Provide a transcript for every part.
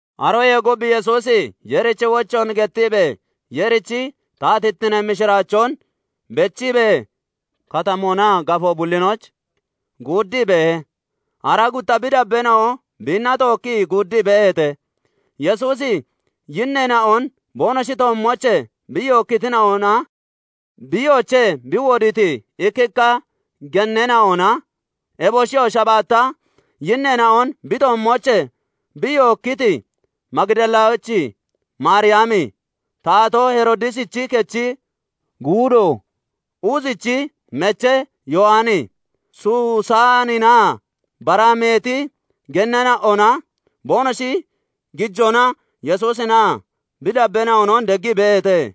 Aroyee gub Yesuusi Yeerichi wochoon gettiibee, Yeerichi taatittinee mishiraachoon bechiibee, katamoonaa gafoo bullinooch guuddii beehe; aaraa gutta bi dabbeena'o biinna tookkii guuddii beeheete. Yesuusi yinneena'on boonoshi toommoochee bi yookkitina'onaa biiyoochee bi wodiiti ikkikka genneena'ona, eboshiyoo shabaatta yinneena'on bi toommoochee bi yookkiti Magidalachi Maariyami, Taatoo Heroodisichi kechi guudo kuuzichi mechee Yowani, Susaaninaa bara meeti genneena'ona boonoshi gijoona Yesuusinaa bi dabbeena'onon deggii beeheete.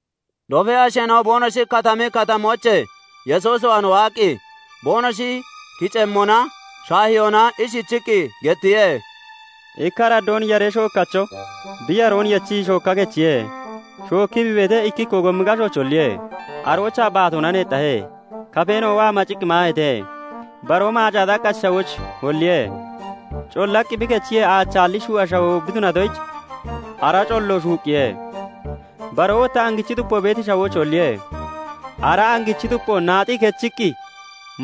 Dofee asheena'o boonoshi katami katamoochee Yesuus waan waaqqi boonoshi kiceemmona, shaahiyoona ishichiqqi gettiye; "Ikka araddoon Yaree shookkacho bi yaroon yechiqqi shookka kechiye. shookkii bi beetee, ikkikkoo gommi gashooch holliye; aroochaa baatoona neexxahe; kafeena'oo waa maciqqi maaheete. Baroo maacaa xaqqachi shawooch holliye; collaqqi bi kechiyee, aachaalli shuu'a shawoo bi tunatoyich, ara collo shuuqqiye. Baroo wotta angichi xupo beeti shawooch holliye; ara angichi xupoo naaxii (nocii) kechiqqi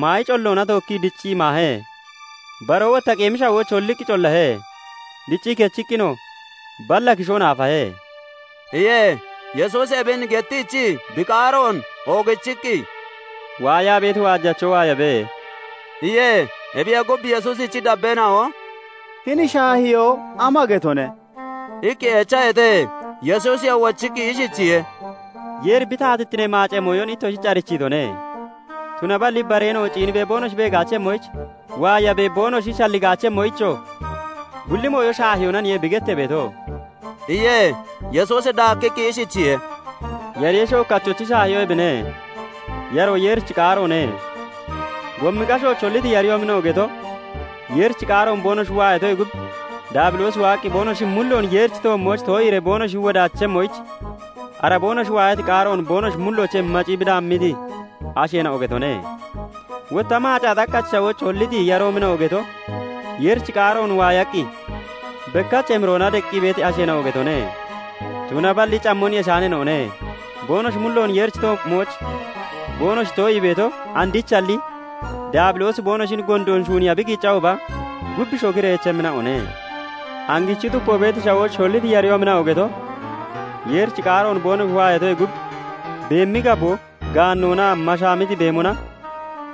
maayi colloona tookkii diciqqi maahe. Baroo wotta qeemi shawooch holliqqi collahe; diccii kechiqqinoo balla kishoon aafahe" iye. Yesuusi ebin gettiichii bi qaaroon oogichiqqi, "Waayaa beeti waajacho waayabe!" iye. Ebiyee gub, Yesuusichi dabbeena'o "Hini shaahiyoo ama getone?" iqqi echaheete. Yesuusiyoo wochiqqi ishichiye:- "Yeeri bi taatittinee maacee mooyon ittoshich arichiitone; tunaballi bareena'o ciinniibee boonoshi beegaachemmoyich, waayaabee boonoshi shalligaachemmoyichoo bulli mooyo shaahiyoonaniye bi gettee beeto" iye. Yesuusi daakkiqqi ishichiye:- "Yaree shookkachochi shaahiyoo ebine; yaroo Yeerichi qaaroone. Gommi gashooch holliti yaroomina'o geto, Yeerichi qaaroon boonoshi waayatoyee gub Daabiloosi waaqqi boonoshi mulloon Yeerichi toommooch too'iiree boonoshi wodaachemmoyich, ara boonoshi waayati qaaroon boonoshi mulloochee maciqqi bi daammiti asheena'o getone. Wotta maacaa xaqqachi shawooch holliti yaroomina'o geto, Yeerichi qaaroon waayaqqi bekkach emiroona deqqi beeti asheena'o getone; tunaballi cammon yeshaaneena'one; boonoshi mulloon Yeerichi toommooch boonoshi too'ii beeto andichalli, Daabiloosi boonoshin gondoon shuuniiya bi qiiccahooba, gub shokiree echemmina'one. Angichi xupo beeti shawooch holliti yaroomina'o geto, Yeerichi qaaroon boonoshi waayatoyee gub, beemi gaboo, gaannoonaa mashaamiti beemona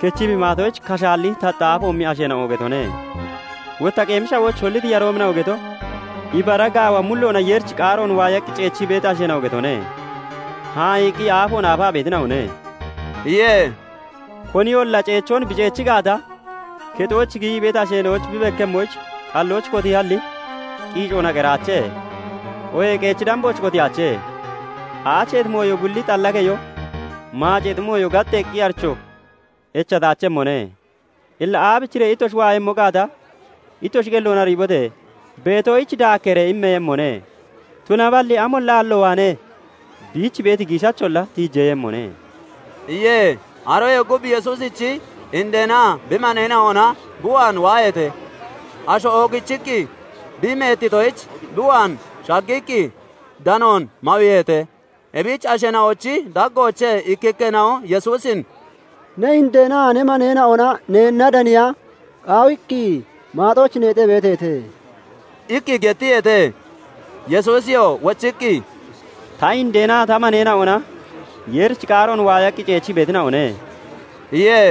kechii bi maatoyich, kashaalli taxxa aafoomi asheena'o getone. Wotta qeemi shawooch holliti yaroomina'o geto, ibara gaawa mulloona Yeerichi qaaroon waayaqqi ceechii beeti asheena'o getone; haa'iiqqi aafoon aafaa beetina'one" iye. "Koniyolla ceechoon bi ceechi gaata, kexooch giyii beeti ashich bi bekkemmoyich xallooch kotiihalli, qiicoona qeraache; oohee qeechi dambooch kotiyaache. Aacheeti mooyo bulli xalla keyo, maaceexi mooyo gaxxeeqqi aricho echataachemmone. Illa aabichiree ittoshi waayemmo gaata, ittoshi qelloon ariibote! Beetoyich daakkeeree immeeyemmone; tunaballi amolla aallo waanee biich beeti giishacholla tiijeeyemmone" iye. Aroyee gub Yesuusichi indeenaa bi maneena'ona bi waan waaheete. Asho oogichiqqi bi meettitoyich, bi waan shaggiqqi danoon mawiiheete. Ebich asheena'ochi daggoochee ikkikkeena'o Yesuusin "Ne indeenaa ne maneena'ona neenna daniya qaawiqqi maaxooch neexaa beeteete" iqqi gettiyeete. Yesuusiyoo wochiqqi, "Ta indeenaa ta maneena'ona Yeerichi qaaroon waayaqqi ceechii beetina'one" iye.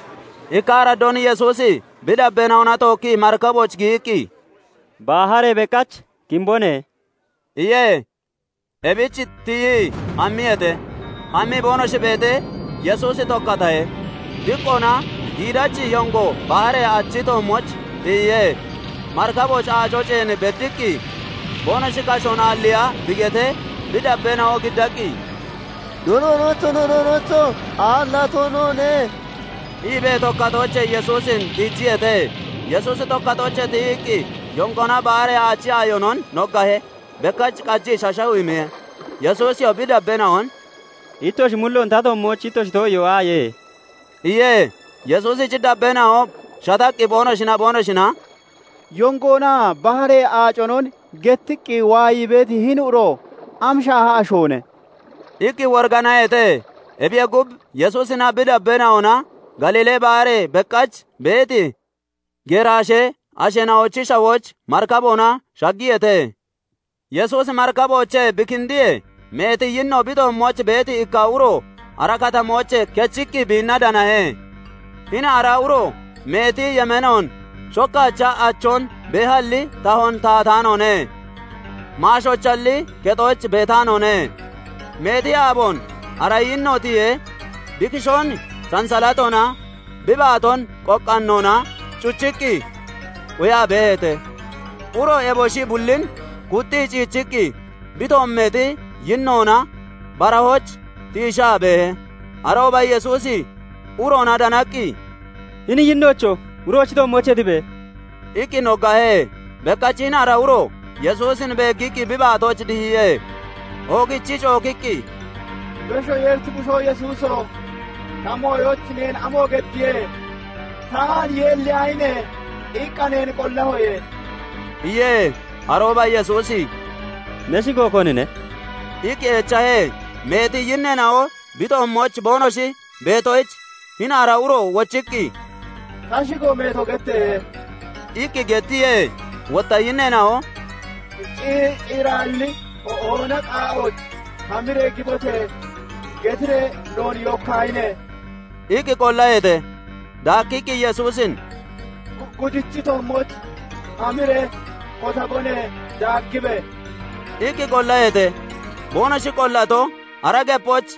Ikka araddoon Yesuusi bi dabbeena'ona tookkii marikabooch giyiqqi, "Baharee beqach kimbone" iye. Ebich tiyii hammiyeete. Hammii boonoshi beetee, Yesuusi tokkatahe. Diqqoona giidachi yongo baharee aachi toommooch tiyiye; marikabooch aaco ceen beddiqqi, boonoshi kashoon aalliiya bi getee, bi dabbeena'o giddaqqi, "No Doonocho! No Doonocho! Aallato noone!" iibee tokkatoochee Yesuusin tiijiyeete. Yesuusi tokkatoochee tiyiqqi yongoonaa baharee aachi aayonon noggahe. Bekkach qajiqqi shashawumiye. Yesuusiyoo bi dabbeena'on "Ittoshi mulloon ta toommooch ittoshi too'iyoo aaye?" iye. Yesuusichi dabbeena'o shataqqi boonoshinaa boonoshina "Yongoonaa baharee aaconon gettiqqi waayii beeti hini uro am shaaha ashoone?" iqqi woriganaheete. Ebiyee gub, Yesuusinaa bi dabbeena'ona Galiilee Baharee beqach beeti Geraashee asheena'ochi shawooch marikaboona shaggiyeete. Yesuusi marikaboochee bi kindiyee, meeti yinno bi toommooch beeti ikka uro ara katamoochee kechiqqi biinna danahe. Hini ara uroo meeti yemeenoon shokkaacha achoon beehalli tahoon tahataanoone; maashoochalli kexooch beetaanoone. Meeti aaboon ara yinno tiyee, bi kishoon sansalatoona, bi baatoonoo qoqqaannoona cuchiqqi quyaa beeheete; uroo eboshi bullin kuxxii ciichiqqi bi toommeexi yinnoona barahooch tiishaa beehe. Arooba Yesuusi uroona danaqqi, "Hini yinnoocho! Uroochi toommoochee tibe!" iqqi noggahe. Bekkach hini ara uro Yesuusin beeggiqqi bi baatooch dihiye. Oogichii cookiqqi, "Beshoo Yeerich bushoo Yesuuso! Ta mooyooch neen amo geddiye? 'Taan yulliyaahine!' iqqa neen qollahoye" iye. Arooba Yesuusi "Ne shigo konine?" iqqi echahe. Meeti yinneena'o bi toommooch boonoshi beetoyich, hini ara uro wochiqqi, "Ta shigo 'Meeto' getteehe" iqqi gettiye. Wotta yinneena'o " 'Ciiraalli hoona qaa'ooch hamiree gibote!' getiree noon yookkaahine!" iqqi qollaheete. Daakkiqqi Yesuusin "Gudichi toommooch hamiree kotabone; daaggibe!" iqqi qollaheete. Boonoshi qollato, ara gepooch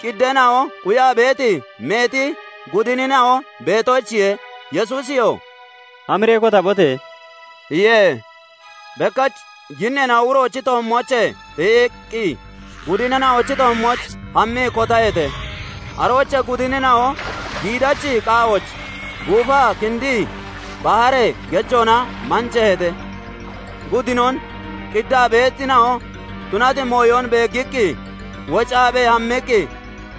qiddeena'o quyaa beeti meeti gudinina'o beetoyichiye. Yesuusiyoo "Hamiree kotabote!" iye. Bekkach yinneena'o uroochi toommoochee tiyiqqi gudinina'ochi toommooch hammii kotaheete. Aroochee gudinina'o giidachi qaa'ooch guufaa kindii baharee gejoona manjaheete. Gudinon qiddaa beetina'o tunati mooyon beeggiqqi, woccaabee hammiqqi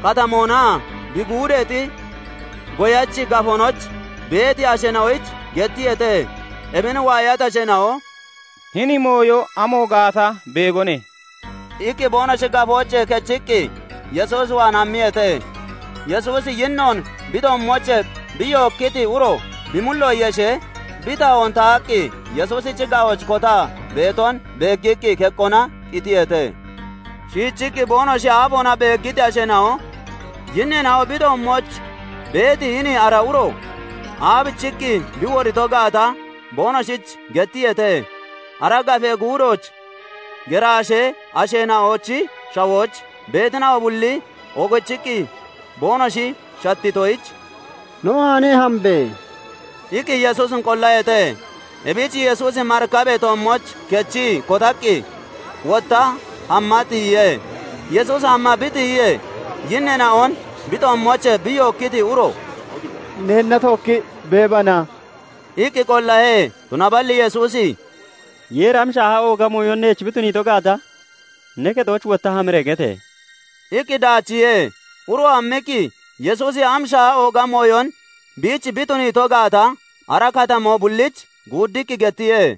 katamoonaa bi guudeexi goyachi gafoonooch beeti asheena'oyich gettiyeete. Ebin waayati asheena'o "Hini mooyo amo gaata beegone" iqqi boonoshi gafoochee kechiqqi Yesuus waan hammiyeete. Yesuusi yinnoon bi toommoochee bi yookkiti uro bi mullo yeshee, bi tahoon tahaqqi Yesuusichi ga'ooch kotaa beeton beeggiqqi keqqoona qitiyeete. shiichiqqi boonoshi aafoona beeggiti asheena'o, yinneena'o bi toommooch beeti hini ara uro aabichiqqi bi wodito gaata boonoshich gettiyeete. Ara gafee guudooch Geraashee asheena'ochi shawooch beetina'o bulli oogichiqqi boonoshi shattitoyich, "No waanee hambe!" iqqi Yesuusin qollaheete. Ebich Yesuusi marikabee toommooch kechii kotaqqi wottaa hamma tiyiye. Yesuusi hamma bi tiyiyee, yinneena'on bi toommoochee bi yookkiti uro "Neenna tookki beebana?" iqqi qollahe. Tunaballi Yesuusi "Yeeri am shaaha ooga mooyon neech bi tuniito gaata ne kexooch wotta hamiree gete!" iqqi daachiihe. Uroo hammiqqi Yesuusi am shaaha ooga mooyon biich bi tuniito gaata ara katamoo bulliich guuddiqqi gettiye.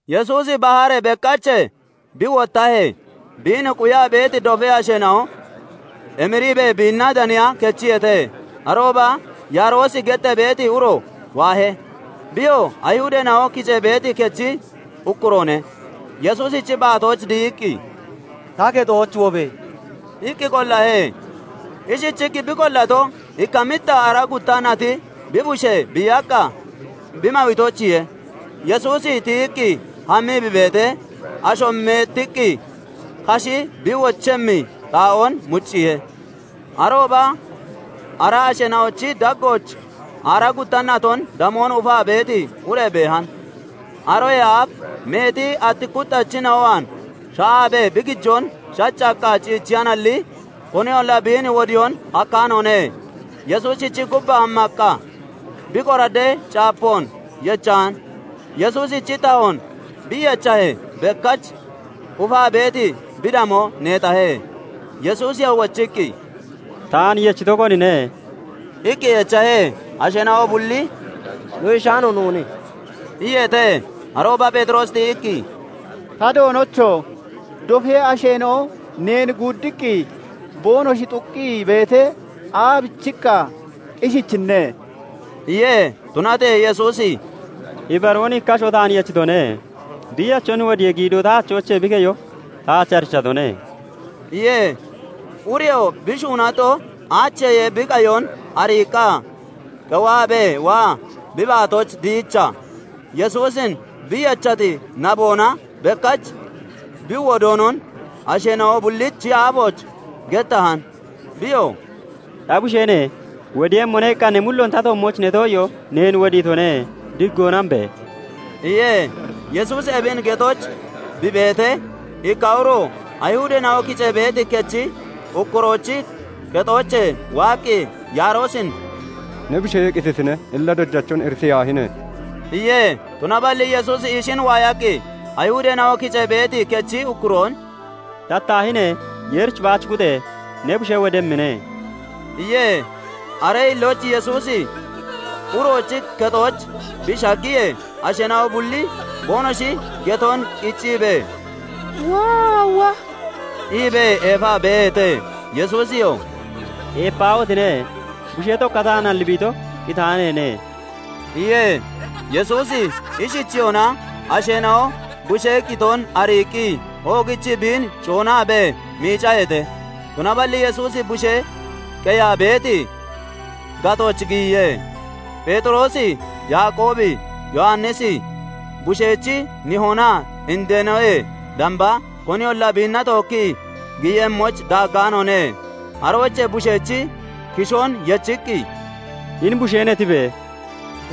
Yesuusi baharee beqachee bi wottahee, biin quyaa beeti dofee asheena'o emiriibee biinna daniya kechiyeete. Arooba Yaaroosi gettee beeti uro waahe. Biyoo Ayihudeena'o kicee beeti kechi ukkuroone; Yesuusichi baatooch dihiqqi, "Ta kexooch wobe!" iqqi qollahe. Ishichiqqi bi qollato, ikka mixxa aaraa gutta nati bi bushee biiyaqqa bi mawiitoyichiye. Yesuusi tiyiqqi hammii bi beetee, asho meettiqqi kashi bi wochemmi xaa'oon mucciihe. Arooba ara asheena'ochi daggooch aaraa gutta naton damoo ufaa beeti ure beehan. [Aroyee aaf meeti atti kuxxachina'o waan sha'aabee bi gijoon shaccaqqa ciichiyanalli,] koniyolla biin wodiyoon hakkaanoone. Yesuusichi gubbaa hammaqqa bi qoraddee caapoon yechan; Yesuusichi tahoon bi yechahee, bekkach ufaa beeti bi damoo neexahe. Yesuusiyoo wochiqqi, "Taan yechito konine?" iqqi echahe. Asheena'o bulli "No yeshaano noone" iyeete. Arooba Pheexiroosi tiyiqqi, "Ta Doonocho! Dofee asheena'o neen guuddiqqi boonoshi xuqqii beetee, aabichiqqa ishichinne?" iye. Tunatee Yesuusi "Ibaroon ikka asho taan yechitone; biiyachon wodiyee giidoo ta achoochee bi keyo taach arichatone" iye. Ureyoo bi shuunato aacheyee bi qayon ariiqqa, qewaabee waa bi baatooch dihiichaa, Yesuusin bi yechati naboonaa bekkach bi wodoonon asheena'o bullichi aafooch gettahan. Biyoo "Ta busheene! 'Wodiiyemmone' iqqa ne mulloon ta toommooch ne too'iyoo neen wodiitone; digoona hambe!" iye. Yesuusi ebin getooch bi beetee, ikka uro Ayihudeena'o kicee beeti kechi ukkuroochi kexoochee waaqqi Yaaroosin "Ne bushee qititine; illa Dojachon iritiyaahine!" iye. Tunaballi Yesuusi ishin waayaqqi Ayihudeena'o kicee beeti kechi ukkuroon "Shattaahine! Yeerich baach kuxe! Ne bushee wodemmine!" iye. Aree hillooch Yesuusi uroochi kexooch bi shaggiyee, asheena'o bulli boonoshi getoon qicciibee, "Woowo!" iibee eefaa beeheete. Yesuusiyoo "Eepaahotine! Bushee tokkataanalli bi ito, qitaaneene" iye. Yesuusi ishichiyona, asheena'o bushee qitoon ariiqqi oogichii biin coonaabee miicaheete. Tunaballi Yesuusi bushee qeyaa beeti gatooch giyiye. Pheexiroosi, Yaaqoobi, Yowannisi, bushechi nihoonaa indeenoyee damba koniyolla biinna tookki giyemmoyich daaggaanoone. Aroochee bushechi kishoon yechiqqi, "Hini busheene! Tibe!"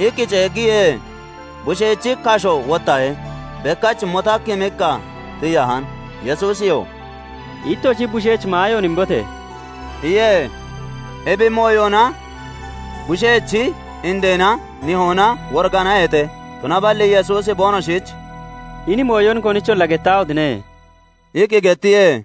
iqqi ceeggiye. Bushechi kashoo wottahe; bekkach motakkimiqqa tiyahan. Yesuusiyoo "Ittoshi bushech maayoon imbote!" iye. Ebi mooyona bushechi indeenaa nihoona woriganaheete; tunaballi Yesuusi boonoshich "Hini mooyon konicholla gettaahotine!" iqqi gettiye.